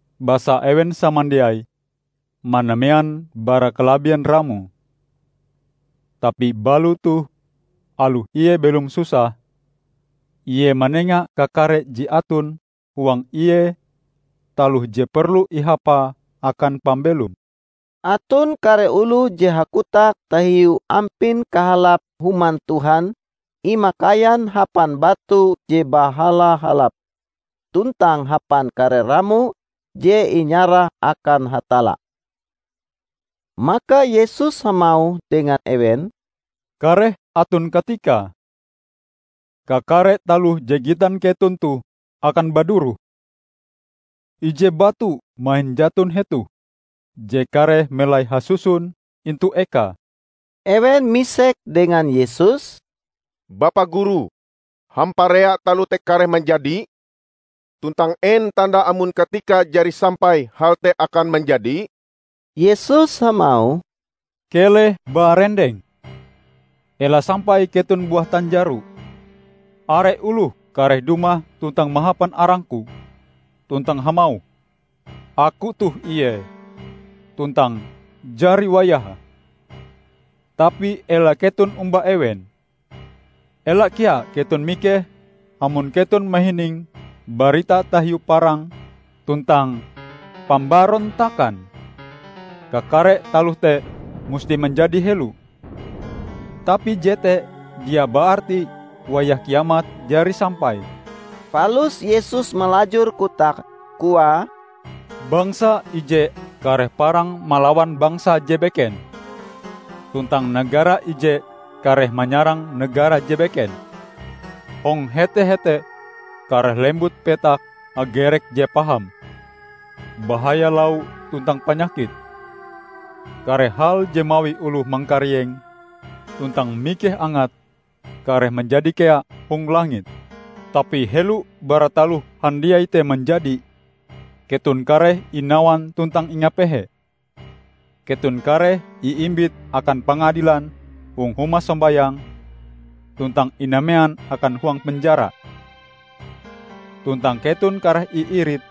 Basa ewen samandiai manamean bara kalabien ramoe. Tapi balo toh aloh ie belom susah, ie manenga kakare je aton huang ie taloh je perlu ihapae akan pambelome." Aton kare oloh je hakotak tahiu ampin kahalap Human Tuhan imakaian hapan batu je bahala-halap tuntang hapan kare ramo je inyarah akan Hatalla. Maka Yesus hamauh dengan ewen, "Kareh aton katikae, kakare taloh je gitan keton toh akan baduroh; ije batu mahin jaton hetoh je kareh melai hasusun intu ekae!" Ewen misek dengan Yesus, "Bapa Guru, hamparea taloh te kareh manjadi? Tuntang en tandae amon katikae jari sampai hal te akan manjadi?" Yesus hamauh, "Keleh barendeng, ela sampai keton buah tanjaro. Are oloh kareh dumah tuntang mahapan arang-Ku, tuntang hamauh, 'Aku toh ie!' tuntang 'Jari wayahe.' Tapi ela keton omba ewen. Ela kea keton mikeh amon keton mahining barita tahiu parang tuntang pambarontakan. Kakare taloh te musti manjadi helo. Tapi jete dia baarti wayah Kiamat jari sampai." Palus Yesus malajur kotake koae, "bangsa ije kareh parang malawan bangsa je beken tuntang negara ije kareh manyarang negara je beken. Hong hete-hete kareh lembut petak hagerek je paham, bahaya lau tuntang panyakit. Kare hal je mawi oloh mangkarieng tuntang mikeh angate kareh manjadi kea hong langit. Tapi helo bara taloh handiai te manjadi, keton kareh inawan tuntang ingapehe. Keton kareh iimbit akan pangadilan hong huma sombayang tuntang inamean akan huang penjara. Tuntang keton kareh iirit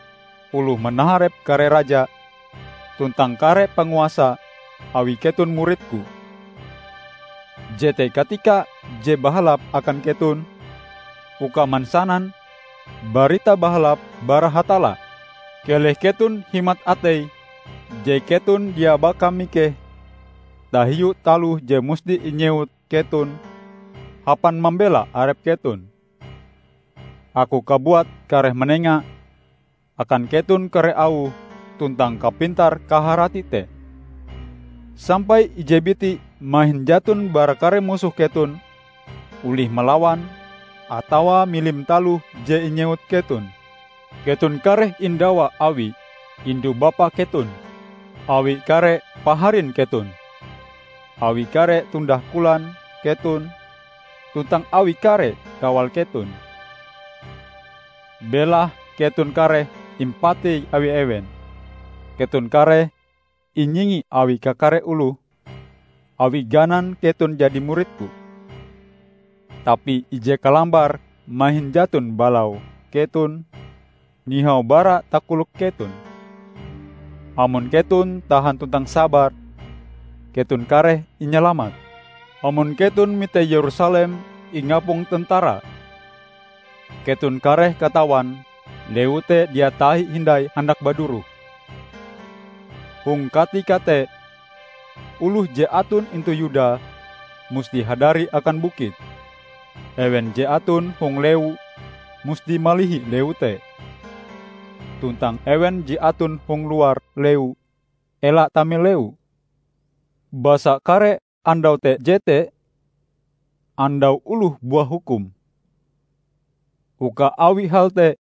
oloh manaharep kare raja tuntang kare panguasa awi keton murid-Ku. Jete katika je bahalap akan keton uka mansanan Barita Bahalap bara Hatalla. Keleh keton himat atei je keton dia baka mikeh tahiu taloh je musti inyewut keton hapan mambela arep keton. Aku kabuat kareh manenga akan keton kare auh tuntang kapintar-kaharati te, sampai ije biti mahin jaton bara kare musoh keton olih malawan atawa milim taloh je inyewut keton. Keton kareh indawa awi indu-bapa keton, awi kare paharin keton, awi kare tundah kolan keton tuntang awi kare kawal keton. Belahe keton kareh impatei awi ewen. Keton kareh inyingi awi kakare oloh awi ganan keton jadi murid-Ku. Tapi ije kalambar mahin jaton balau keton nihau bara takolok keton. Amon keton tahan tuntang sabar, keton kareh inyalamat." "Amon keton mite Yerusalem ingapong tentara, keton kareh katawan lewu te dia tahi hindai handak baduroh. Hong katika te oloh je aton intu Yuda musti hadari akan bukit. Ewen je aton hong lewu musti malihi lewu te, tuntang ewen je aton hong luar lewu ela tame lewu. Basa kare andau te jete 'Andau Oloh Buah Hukum', uka awi hal te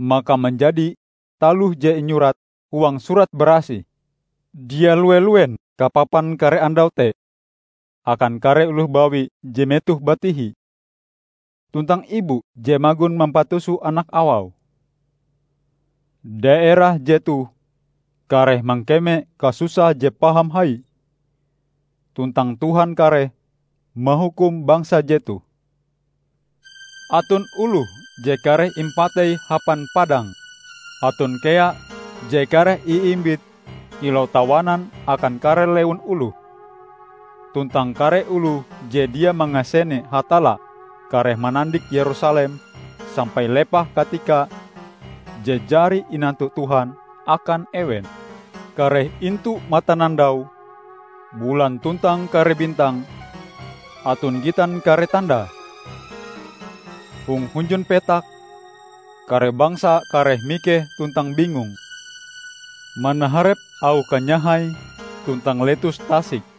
maka manjadi taloh je inyurat huang Surat Barasih. Dia lue-luen kapapan kare andau te akan kare oloh bawi je metohe batihi, tuntang ibu je magon mampatuso anak awau! Daerah jetoh kareh mangkeme kasusah je paham hai, tuntang Tuhan kareh mahukum bangsa jetoh. Aton oloh je kareh impatei hapan padang, aton kea je kareh iimbit kilau tawanan akan kare lewun oloh; tuntang kare oloh je dia mangasene Hatalla kareh manandik Yerusalem sampai lepah katika je jari inantu Tuhan akan ewen." "Kareh intu matanandau, bulan tuntang kare bintang aton gitan kare tanda. Hong hunjun petak, kare bangsa kareh mikeh tuntang bingung manaharep auh kanyahai tuntang letus tasik.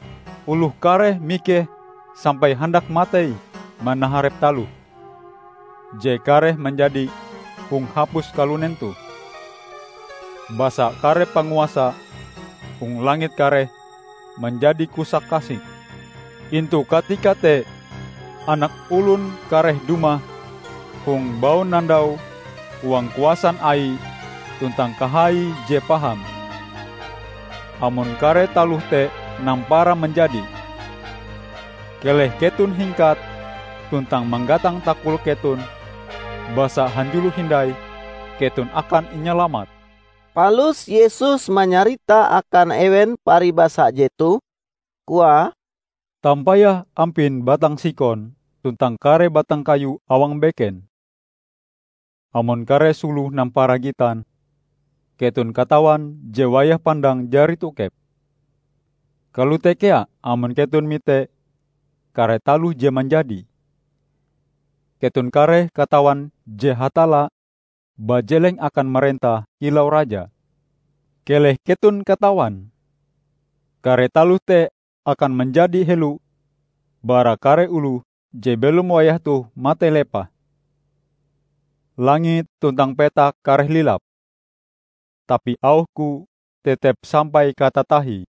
Oloh kareh mikeh sampai handak matei manaharep taloh je kareh manjadi hong hapus kalunen toh, basa kare panguasa hong langit kareh manjadi kusak-kasik. Intu katika te Anak Olon kareh dumah hong baunandau huang kuasan Aie tuntang kahaie je paham. Amon kare taloh te nampara manjadi, keleh keton hingkat tuntang manggatang takolok keton, basa hanjulo hindai keton akan inyalamat." Palus Yesus manyarita akan ewen paribasa jetoh, koae, "Tampayah ampin batang sikon tuntang kare batang kayu awang beken. Amon kare sulohe nampara gitan, keton katawan je wayah pandang jari tokep. Kalote kea amon keton mite kare taloh je manjadi, keton kareh katawan je Hatalla bajeleng akan marentah kilau Raja. Keleh keton katawan! Kare taloh te akan manjadi helo bara kare oloh je belom wayah toh matei lepah. Langit tuntang petak kareh lilap, tapi auh-Ku tetep sampai katatahie."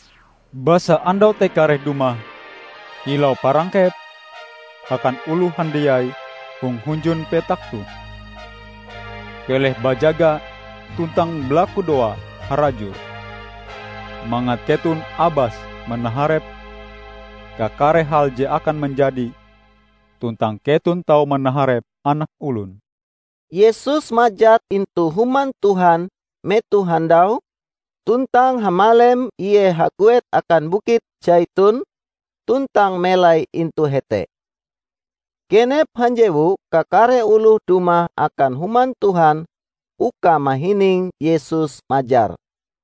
Basa andau te kareh dumah kilau parangkep akan oloh handiai hong hunjun petak toh. Keleh bajaga tuntang balakudoa harajur mangat keton abas manaharep kakare hal je akan manjadi tuntang keton tau manaharep Anak Olon." Yesus majar intu Human Tuhan metoh handau, tuntang hamalem Ie haguet akan Bukit Saiton tuntang melai intu hete. Genep hanjewu kakare oloh dumah akan Human Tuhan uka mahining Yesus majar.